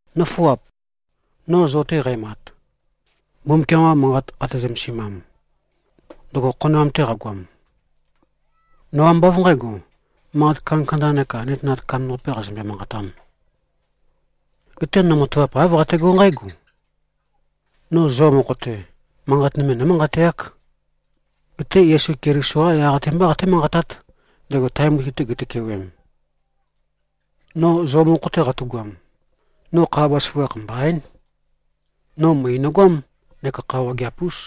Nǿfuap! No zo-te qæmat, Mbumbukiam-qa Manqat qate-zømesimam, ndøgo khonoam-te qagoam, no ambá av nqǣgo, manqat kandakanda neka nøtenat kandambaqapē qazømbe-manqatām. Geté no matavap āv qategó nqǽgo: No zo mokho-te, manqat nøme nǿmanqateák. Geté Yesu Keliso-qá yaq-te mbá qaté-manqatát, ndego tae mutui-te gitøkewem. No zo mokho-te qatu꞉goam, no kha bazaføgakh mbaín. No møe nøgoám neka kha wageap-ús.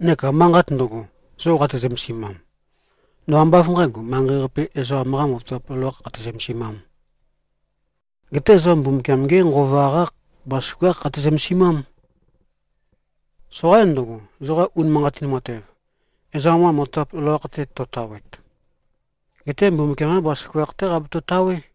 Neka manqat ndøgo, zo qate-zømesimam, no ambá av nqǣgo, manqei-qape ezoqam-qā matavap loloākh qate-zømesimām. Geté zo Mbumbukiam-ge Nqova-qá bazaføgákh qate-zømesimám. Soqaín ndøgo, zoqa unimanqatin matev, ezoqam-qa matavap loloakh-te to꞉tawet. Geté Mbumbukiam-qá bazaføgakh-té qabeto꞉-tawé.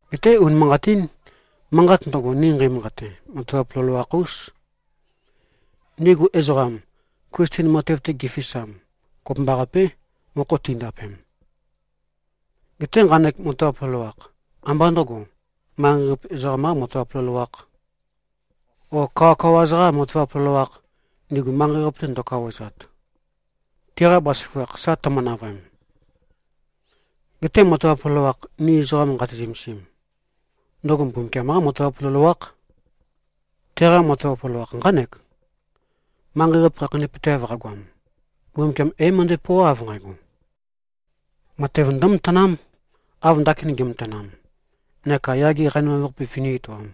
Geté, unimanqatín. Manqat ndøgo, ni nqeimanqate, matavap loloakh-ús. Ndigu ezoqam, Klisten matev-te gifisam, kopømbaqapé, mokho tindapem. Geté nqanek matavap loloakh, ambá ndø̄go, manqei-qape ezoqam-qā matavap loloākh, o kawakawa-za-qā matavap loloākh, ndigu manqei-qape ndo꞉kawaezat, tiqa bazaføgakh sa tømø-navøem. Geté matavap loloakh, ni ezoqa nqati-zømesim, ndøgo Mbumbukiam-qá matavap loloákh. Teqa matavap loloakh nqánek: Manqei-qape khakheinøpøteav qagoam, Mbumbukiam é-møndo꞉pøoá, av nqægo: Matev ndǿmatanám, av ndakin ge꞉matanam, neka yage qanimav-qape vøní-etoām.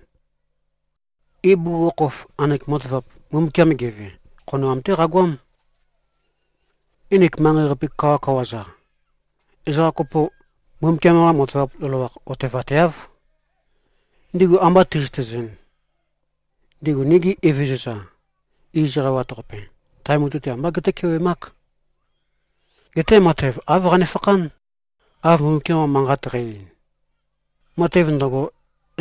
Ibugukhokhof, nqanek matavap, Mbumbukiam geve, khonoam-té qagoám. Nginik manqei-qape kawakawa-za, ezoqa kopo, Mbumbukiam-qa matavap loloakh otevateáv. Ndigu amba ti꞉zøtezɨn, ndigu nigi Evezøza iz eqawat-qape, tae mutui-te ambá gétøkewemák. Geté matev av qanefakhán, av Mbumbukiam-qa Manqat qæ-ein, “Matev ndøgo,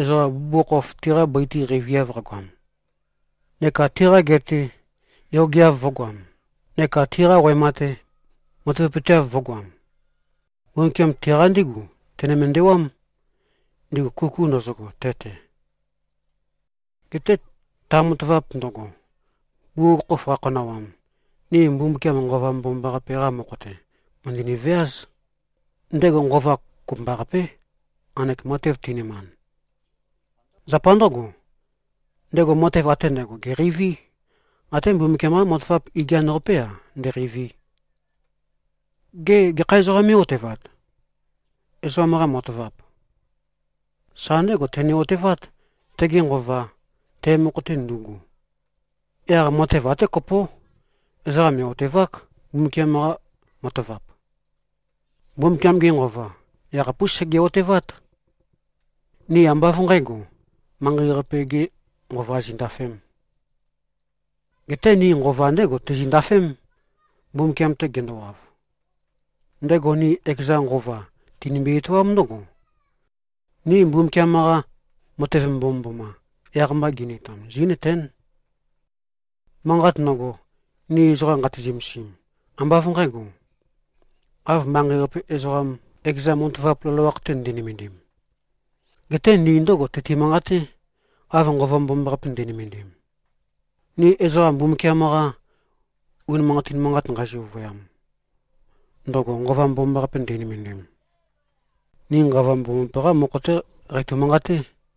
ezoqa bugukhokhof tiqa bøi-te qeiviav qagoam neka tiqa gea-te yogeav vø̄goam neka tiqa wema-te matavapøteav vø̄goam, Mbumbukiam, tiqa ndígu tene-mendewám, ndigu kuku ndøzøgo te-te.” Geté ta matavap ndøgo, bugukhokhof qakhonawam, ni Mbumbukiam Nqova Mbomambaqape-qa mokho-te, mø̀ndøni-veáz. Ndego Nqova kopømbaqapé, nqanek matev ti꞉nømand. Zapa ndǿgo, ndego matev ate ndægo gèqeiví, até Mbumbukiam-qa matavap igian-qapé-a, ndēqēivī. Gê, gekha ezoqām mé꞉-otevat, ezoqam-qa matavap? Sa ndégo tene-otevát, tege nqova, te mokho-te ndu꞉gu. Yaq matev até kopó: Ezoqa mè꞉-otevák, Mbumbukiam-qa matavap. Mbumbukiam-ge Nqova yakhapús sege꞉-otevát. Ni ambá av nqǣgo, manqei-qape-gē nqova zindafēm. Geté ni Nqova ndégo tizindafém, Mbumbukiam-te gendowav. Ndego ni ekeza Nqova, tinimbi-etoám ndǿgo: Ni Mbumbukiam-qa matev mbomømboma, yaq-mba gini-etoam, zí꞉nøtén. Manqat ndøgo, ni ezoqa nqati-zømesim, ambá av nqǣgo, av manqei-qape ezoqam, ekeza matavap loloakh-te ndi꞉nømendim. Geté ni ndǿgo tøti-manqaté, av Nqova Mbomambaqape ndi꞉nømendim. Ni ezoqa Mbumbukiam-qa unimanqatin manqat nqeizø-ovøyam, ndøgo Nqova Mbomambaqape ndi꞉nømendim, ni Nqova Mbomambaqape-qá mokho-té qeitø-manqaté.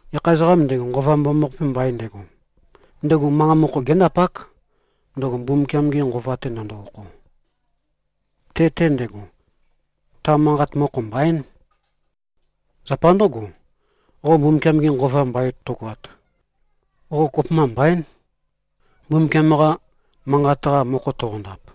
Gekha ezoqām ndego, Nqova Mbomambaqape mbain ndego, ndego manqa mokho géndapák, ndøgo Mbumbukiam-ge Nqova-te ndøndo-okho. Te-te ndego, ta manqat, mokho mbaín. Zapa ndǿgo, qo Mbumbukiam-ge Nqova mbain tøgoat, qo kopømba mbaín, Mbumbukiam-qa Manqat-qa mokho toqondap.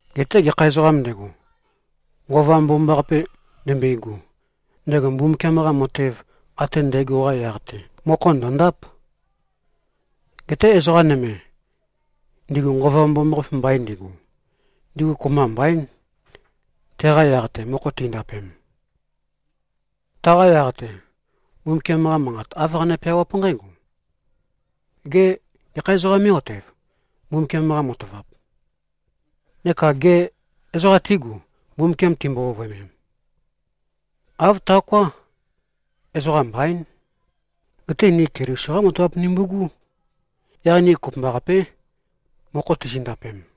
Geté gekha ezoqām ndego, Nqova Mbomambaqape ndembøigu, ndego Mbumbukiam-qa matev ate ndægo-qa yaq-te, mokho ndø̀ndáp. Geté ezoqa nøme, ndigu Nqova Mbomambaqape mbain ndigu, ndigu kopømba mbaín, teqa yaq-te mokho tindapem. Taqa yaq-te, Mbumbukiam-qa Manqat, āv qane-peawáp nqǽgo, “Gê, gekha ezoqām mé꞉-otev, Mbumbukiam-qa matavap? Neka gê, ezoqa tígu, Mbumbukiam timbo-ovøemem?” Āv taoká. Ezoqa mbaín. Geté ni Keliso-qá matavap nimbu꞉gú. Yaq ni kopømbaqapé, mokho tizindapem.